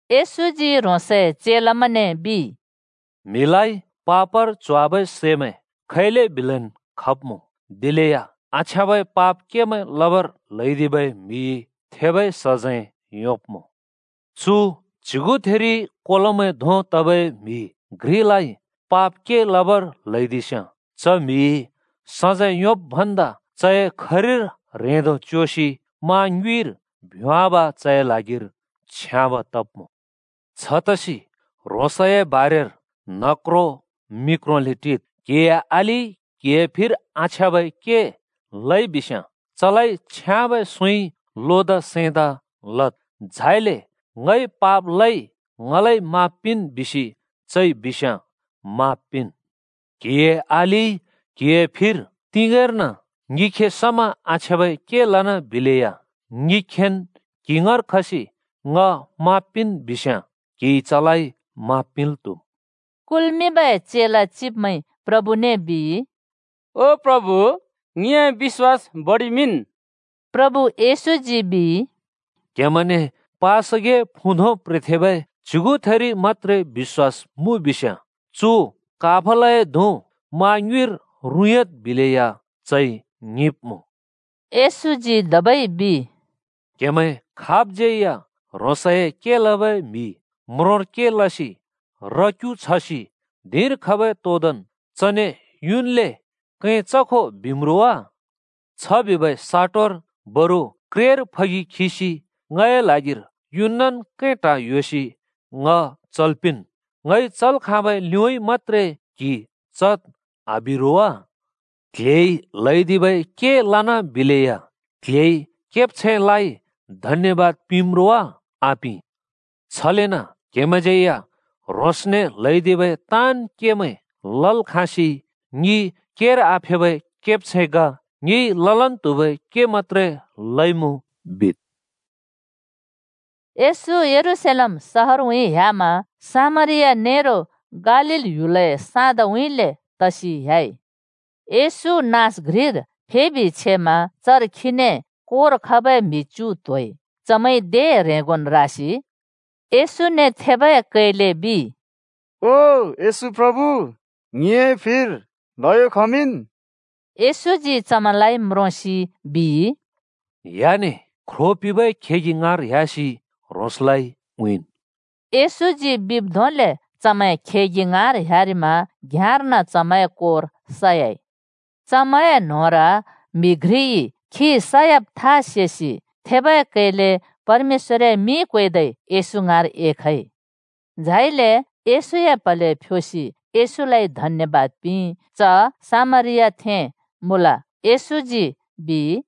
येशूजी ह्रोंसए चेलामैंने बिइ, “म्हिलाइ पापर च्होवाबै सैमैं खैलेबिलेन् खब्मुँ, दिलेया आछ्याँबै पाप केमैं लबर ल्हैदिबै म्हिइ थेबै सजैं योंब्मुँ। चु च्‍युगुथिरि कोलोमैं धों तबै म्हि घ्रिलाइ पाप के लबर ल्हैदिस्याँ च म्हिइ सजैं योंब् भन्दा चए खरिर ह्रेंदो च्‍योसि मा ङ्युँइर भ्‍योंवाब् चए ल्हागिर छ्याँब तब्मुँ। छतसि ह्रोंसए बारेर न्ह क्रों मि क्रोंले टिद्। “क्‍हिए अलिइ क्हिए फिर आछ्याँबै के लइबिस्‍याँ चलाइ छ्याँबै सुँइ लोदा सैंदा लद्, झाइले ‘ङइ पाप लइ ङलाइ माफ पिंन्,’ बिसि चइ बिस्‍याँ माफ पिंन्। क्‍हिए अलिइ क्‍हिए फिर तिगेंर्न ङिखे समा आछ्याँबै के लना बिलेया ङिखेन् क्‍हि ङाँर खसि ङ ‘माफ पिंन्’ बिस्‍याँ क्हिइ चलाइ माफ पिंल् त्‍हुम्।” कुल्मिंबै चेला चिब्मैंइ प्रभुने बिइ, “ओ प्रभु, ङिए बिश्‍वास बडिमिंन्।” प्रभु येशूजी बिइ, “क्‍हेमैंने पासगिए फुँ धों प्रेथेबै च्‍युगुथिरि मत्‍त्रे बिश्‍वास मुँ बिस्याँ ‘चु काफलए धुँ मा ङ्युँइर रुँइँयाद्,’ बिलेया चइ ङिंब्मुँ।” येशजी धबै बिइ, “क्‍हेमैं खाबज्यै या ह्रोंस‍ए के लबै म्‍हि म्रोंर के लसि र-क्‍यु छसि धिंर खबै तोदोंन् चने युन्ले ‘कैं चखो,’ बिम्‌ रो वा? छ बिबै साटोरि बरु ‘क्रेर फगि खिसि ङए ल्हागिर युनन् कैं, ट्हा ह्‍योसि ङ चल् पिंन्। ङइ चल् खाँबै लिउँइँ मत्‍त्रे क्हि चद्,’ आबि रो वा? क्ल्हेइ ल्हैदिबै के लना बिलेया क्ल्हेइ केब्छैंलाइ धन्‍यबाद पिंम्‌ रो वा? आपिं। छलेन क्‍हेमैंज्यै या ह्रोंसने ल्‍हैदिबै ताँन् केमैं लल् खाँसि ‘ङि केर आफेबै केब्छैं ग, ङिइ ललन् त्हुबै के मत्‍त्रे लइमुँ।’ बिद्।” येशू यरूशलेम सहरउँइँ ह्‍यामा सामरिया नेरो गालील ह्‍युलए साँदउँइँले तसि ह्‍याइ। येशू नाँस घ्रिर फेबि छेमा चर खीने कोर खबै म्‍हि च्‍यु त्‍होइ। चमैंइ दे ह्रेंगोन् रासि येशूने थेबै कैले बिइ, “ओ येशू प्रभु, ङिए फिर ल्हयो खमिंन्।” चमैंलाइ म्रोंसि येशूजी बिइ, “ह्‍याने! ख्रो पिंबै खेगि ङाँर ह्‍यासि ह्रोंसलाइ उँइँन्।” येशूजी बिब् धोंले चमैं खेगि ङाँर ह्‍यारिमा घ्‍याँर्न चमैंए कोर सयाइ। चमैंए न्होंर म्‍हि घ्रिइ खी सयाब था सेसि थेबै कैले परमेश्‍वरए मिं क्वेदै येशू ङाँर एखइ। झाइले येशूए प्‍हले फ्‍योसि येशूलाइ धन्‍यबाद पिंइ। च सामरियाथें मुँल। येशूजी बिइ,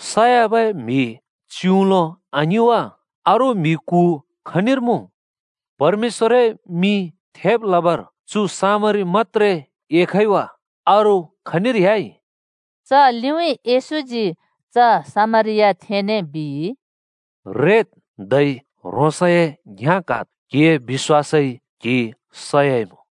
“सब म्हि च्युउलो आङिं वा? अरू म्‍हि कु खनिर मुँ? परमेश्‍वरए मिं थेब् लबर चु सामरी मत्‍त्रे एखइ वा अरू खनिर ह्‍याइ?” च लिउँइँ येशूजी च सामरियाथेंने बिइ, “रेदु, धै ह्रोंसए घ्याँ क्हाद्। क्‍हिए बिश्‍वासइ क्‍हि सइमुँ।”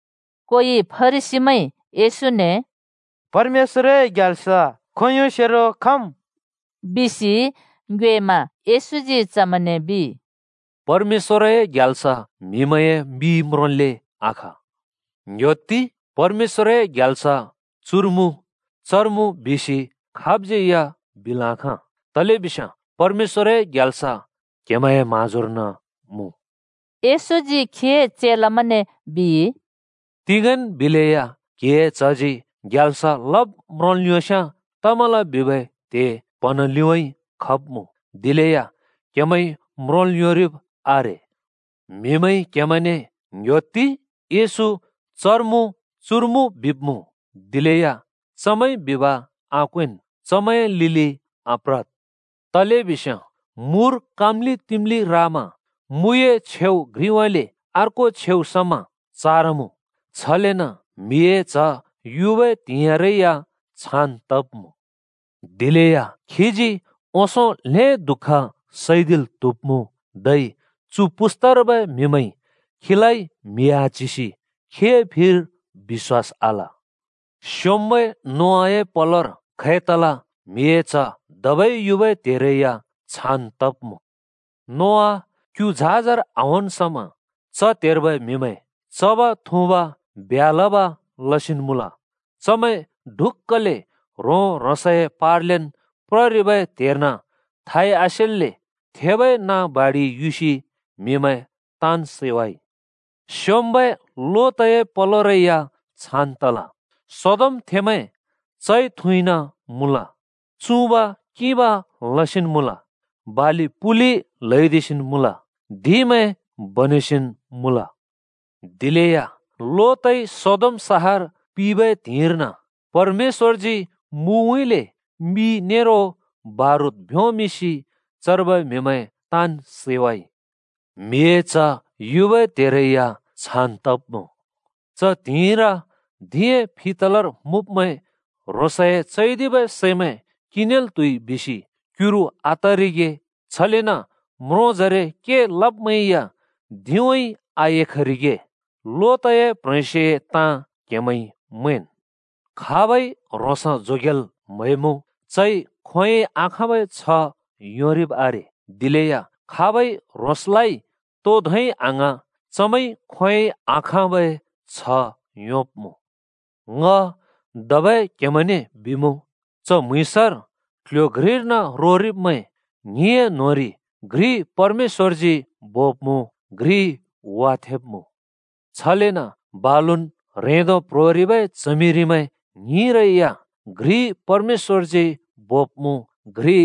कोइ फरिसीमैंइ येशूने “परमेश्‍वरए ग्याल्स खोंयोंसेरो खम्?” बिसि ङ्योएमा येशूजी चमैंने बिइ, “परमेश्‍वरए ग्याल्स म्हिमैंए मिइ म्रोंल्‍ले आखा। ‘ङ्‌ह्‍योत्ति! परमेश्‍वरए ग्याल्स चुर मुँ’ ‘चर मुँ’ बिसि खाबज्‍यै बिल् आखाँ। तलेबिस्याँ परमेश्‍वरए ग्याल्स क्‍हेमैंए म्‍हाँजोर्न मुँ।” येशूजी खीए चेलामैंने बिइ, “तिंगेंन् बिलेया म्हिए च्हजी ग्याल्स लब् म्रोंल् योंस्याँ तमल बिबै त्‍हे प्हँन लिउँइँ खब्मुँ, दिलेया क्हेमैंइ म्रोंल् योंरिब् आरे। म्हिमैंइ क्‍हेमैंने ‘ङ्‍ह्‍योत्ति! येशू चर मुँ’, ‘चुर मुँ,’ बिब्‍मुँ। दिलेया चमैंइ बिब आक्वेंन्, चमैंए लिलि आप्रद्। तलेबिस्याँ मुर काँम्‍लि-तिम्‍लि रामा मुए छेउ घ्रिउँइँले अर्को छेउ समा चारमुँ, छलेन म्हिए च्ह युबै त्हिंइरै या छान् तब्मुँ। दिलेया खीजी ओंसों ल्हें दुःख सैदिल् त्हुब्मुँ, धै चु पुस्तार्बै म्हिमैंइ खीलाइ म्हि आच्हिसि खीए फिर बिश्वास आल। “स्‍योंम्‍बै नोआए पलोर खै तल, म्हिए च्ह धबै युबै त्‍हेरै या छान् तब्‍मुँ। नोआ क्‍यु झाजर आहोंन् समा च त्‍हेर्बै म्हिमैं चब, थुँब, ब्ह्‍या लब लसिन् मुँल, चमैं छले ढुक्‍कले ह्रों-ह्रोसए पार्लेन् प्ररिबै त्हेर्न थाइ आसेल्‍ले थेबै नाँ बाडिइ युसि म्हिमैं ताँन् सैवाइ। “स्‍योंम्‍बै लोतए पलोरै या छान् तल। सदोमथेंमैं चइ-थुँइन मुँल, चुँब्-किंब लसिन् मुँल, बालि-पुलि ल्‍हैदिसिन् मुँल, धिंमैं बनेसिन् मुँल। दिलेया लोतइ सदोम सहर पिबै त्हिंइर्न परमेश्‍वरजी मुउँइँले मि नेरो बारुद भ्‍योंमिंसि चर्बै म्हिमैं ताँन् सैवाइ। म्हिए च्ह युबै त्हेरै या छान् तब्‍मुँ। “च त्हिंइर धिंए फि तलर मुँब्‍मैं ह्रोंसए चैदिबै सैमैं किंनेल् त्हुइ बिसि क्युरु आतरिगे छलेन म्रोंजरे के लब्‍मैंया धिंउँइँ आएखरिगे। लोतए प्ह्रेंस्योए ताँ क्‍हेमैंइ मैंन्। खाबइ ह्रोंस जोगेल् म्‍हैमुँ, चइ खोंयोंइ आखाँबै छ्ह योंरिब् आरे, दिलेया खाबइ ह्रोंसलाइ तो धोंइ आङ्हाँ चमैंइ खोंयोंइ आखाँबै छ्ह योंब्‍मुँ। ङ धबै क्‍हेमैंने बिमुँ, च म्‍हुँइँसर क्‍ल्‍ह्‍यो घ्रिर्न रोरिब्मैं ङ्हिंए न्‍होंरि घ्रि परमेश्‍वरजी बोब्‍मुँ, घ्रि वाथेंब्‍मुँ। छलेन बालुन् ह्रेंदो प्‍ह्रोरिबै च्हमिरिमैं ङ्हिंरै या घ्रि परमेश्‍वरजी बोब्मुँ घ्रि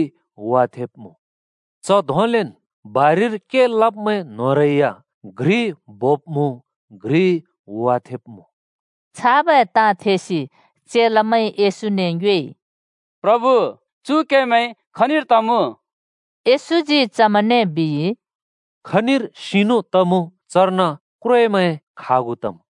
वाथेंब्‍मुँ। [ च धोंलेन् बारिर के लब्मैं न्‍होंरै या घ्रि बोब्‍मुँ, घ्रि वाथेंब्‍मुँ।]” छाबै ताँ थेसि चेलामैंइ येशूने ङ्योएइ, “प्रभु चु केमैं खनिर तमुँ?” येशूजी चमैंने बिइ, “खनिर सिनु तमुँ चर्न क्‍व्रेमैं खागु तम्।”